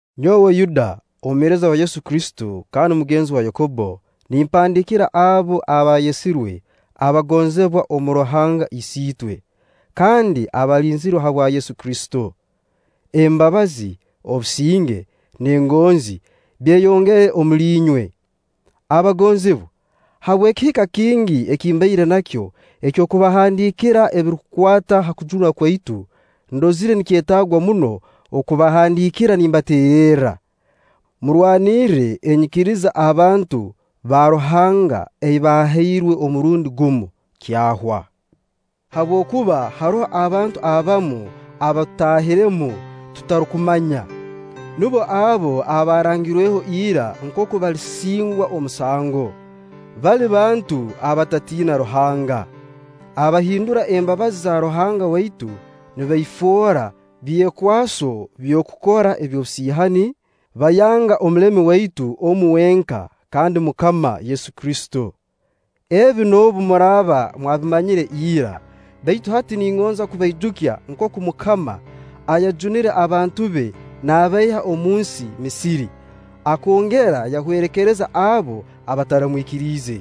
Nyowe Yuda, omuheereza wa Yesu Kristo kandi mugenzi wa Yakobbo, nimpandiikira abo abaayesirwe, abagonzibwa omu Ruhanga Isiitwe, kandi abaalinzirwe habwa Yesu Kristo: Embabazi, obusinge, n'engonzi byeyongere omuli inywe. Abagonzibwa, habw'ekihika kingi eki mbaire nakyo eky'okubahandiikira ebirukukwata ha kujunwa kwaitu, ndozire nikyetaagwa muno okubahandiikira nimbateererra: murwanirre enyikiriza abantu ba Ruhanga ei baahairwe omurundi gumu, kyahwa. Habwokuba haroho abantu abamu abaatutaahiremu tutarukumanya. Nubo abo abaarangirweho ira nkooku balisingwa omusango. Bali bantu abatatiina Ruhanga, abahindura embabazi za Ruhanga waitu nibaifoora byekwaso by'okukora eby'obusiihani, baayanga Omulemi waitu omu wenka kandi MUKAMA Yesu Kristo. Ebi noobu muraaba mwabimanyire ira, baitu hati ningonza kubaijukya nkooku MUKAMA, ayajunire abantu be naabaiha omunsi Misiri, akongera yahwerekereza abo abataramwikiriize.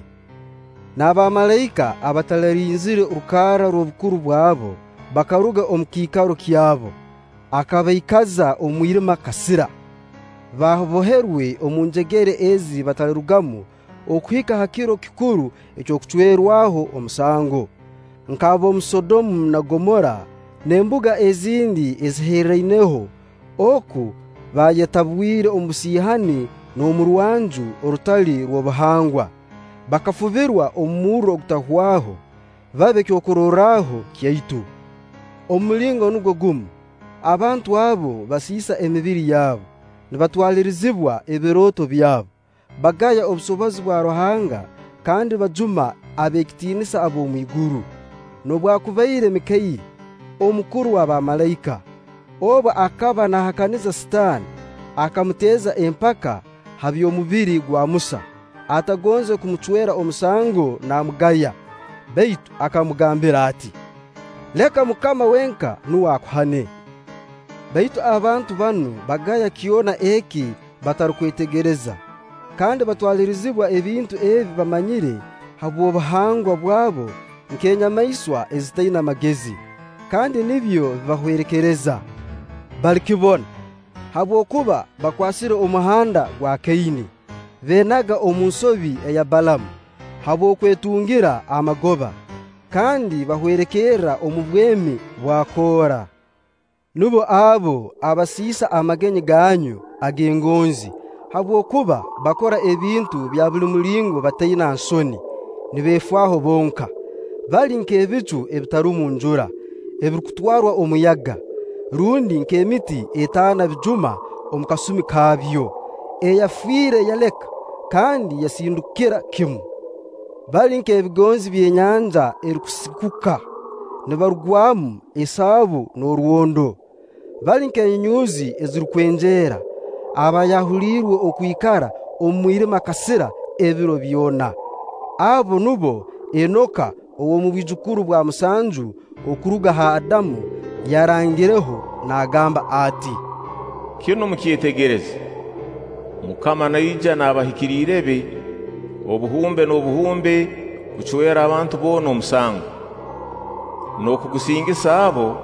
Na bamalaika abataralinzire rukarra rw'obukuru bwabo bakaruga omu kiikaro kyabo, akabaikaza omu mwirima kasira, baboherwe omu njegere ezi batalirugamu okuhika ha kiro kikuru eky'okucwererwaho omusango; nk'ab'omu Sodomu na Gomora n'embuga ezindi ezaaherraineho oku baayetabwire omu busiihani n'omu rwanju orutali rw'obuhangwa, bakafubirwa omu murro ogutahwaho, babe kyokurorraho kyaitu. Omu mulingo nugwo gumu, abantu abo basiisa emibiri yabu, nibatwalirizibwa ebirooto byabo, bagaya obusobozi bwa Ruhanga kandi bajuma ab'ekitiinisa ab'omu iguru. Noobwakubaire Mikairi, omukuru wa baamalaika, obu akaba naahakaniza Sitaani, akamuteeza empaka ha by'omubiri gwa Musa, atagonze kumucwera omusango naamugaya, baitu akamugambira ati: “Leka MUKAMA wenka nuwe akuhane.” Baitu abantu banu bagaya kyona eki batarukwetegereza, kandi batwalirizibwa ebintu ebi bamanyire habw'obuhangwa bwabo nk'enyamaiswa ezitaina magezi, kandi nibyo bibahwerekereza. Balikibona! Habwokuba bakwasire omuhanda gwa Kaini, beenaga omu nsobi eya Balaamu habw'okwetungira amagoba, kandi bahwerekererra omu bwemi bwa Koora. Nubo abo abasiisa amagenyi ganyu ag'engonzi habwokuba bakora ebintu bya buli mulingo bataina nsoni, nibeefaaho bonka. Bali nk'ebicu ebitarumu njura, ebirukutwarwa omuyaga; rundi nk'emiti etaana bijuma omu kasumi kaabyo, eyafiire yaleka, kandi yasindukira kimu. Bali nk'ebigonzi by'enyanja erukusikuka, nibarugwamu esaabu n'orwondo. Bali nk'enyunyuuzi ezirukwenjeera, abaayahuliirwe okwikara omu mwirima kasira ebiro byona. Abo nubo Enoka ow'omu bwijukuru bwa musanju okuruga h'Adamu yarangireho naagamba ati: “Kinu mukyetegereze, MUKAMA naija n'abahikiriire be obuhumbe n'obuhumbe kucwera abantu boona omusango, n'okugusingisa abo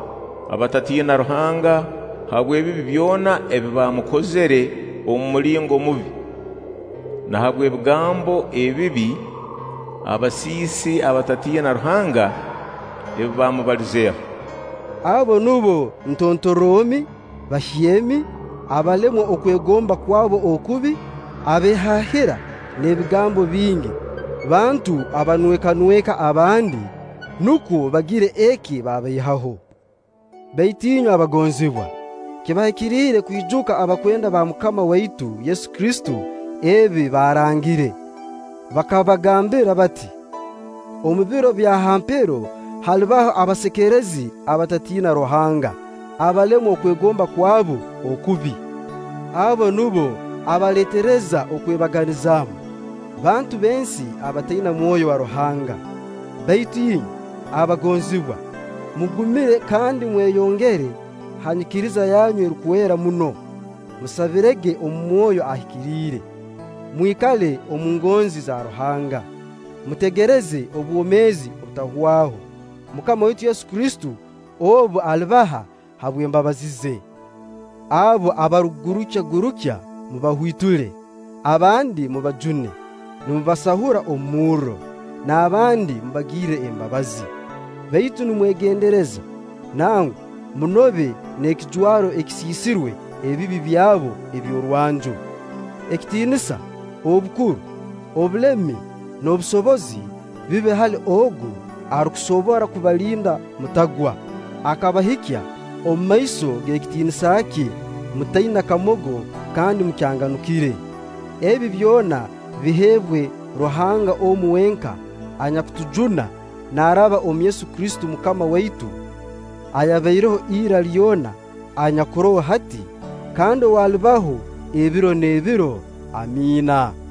abatatiina Ruhanga habw'ebibi byona ebi baamukozire omu mulingo mubi, na habw'ebigambo ebibi abasiisi abatatiina Ruhanga ebi baamubalizeeho.” Abo nubo ntontorromi, bahyemi, abalemwa okwegomba kwabo okubi, abeehaahira n'ebigambo bingi, bantu abanwekanweka abandi, nukwo bagire eki babaihaho. Baitu inywe abagonzibwa, kibahikiriire kwijuka abakwenda ba MUKAMA waitu Yesu Kristo ebi baarangire. Bakabagambira bati: “Omu biro bya ha mpero halibaho abasekerezi abatatiina Ruhanga, abalemwa okwegomba kwabu okubi.” Abo nubo abaleetereza okwebaganizaamu, bantu b'ensi abataina Mwoyo wa Ruhanga. Baitu inywe, abagonzibwa, mugumire kandi mweyongere ha nyikiriza yanyu erukwera muno; musabirege omu Mwoyo Ahikiriire. Mwikale omu ngonzi za Ruhanga, mutegereze obwomeezi obutahwaho MUKAMA waitu Yesu Kristo obu alibaha habw'embabazi ze. Abo abarukugurukyagurukya, mubahwitule; abandi mubajune, nimubasahura omu murro; n'abandi mubagirre embabazi, baitu nimwegendereza, nangwa munobe n'ekijwaro ekisiisirwe ebibi byabo eby'orwanju. Ekitiinisa, obukuru, obulemi n'obusobozi bibe hali Ogu arukusobora kubalinda mutagwa, akabahikya omu maiso g'ekitiinisa kye mutaina kamogo kandi mukyanganukire. Ebi byona biheebwe Ruhanga omu wenka anyakutujuna naaraba omu Yesu Kristo MUKAMA waitu ayabaireho ira lyona, anyakuroho hati, kandi ow'alibaho ebiro n'ebiro. Amiina.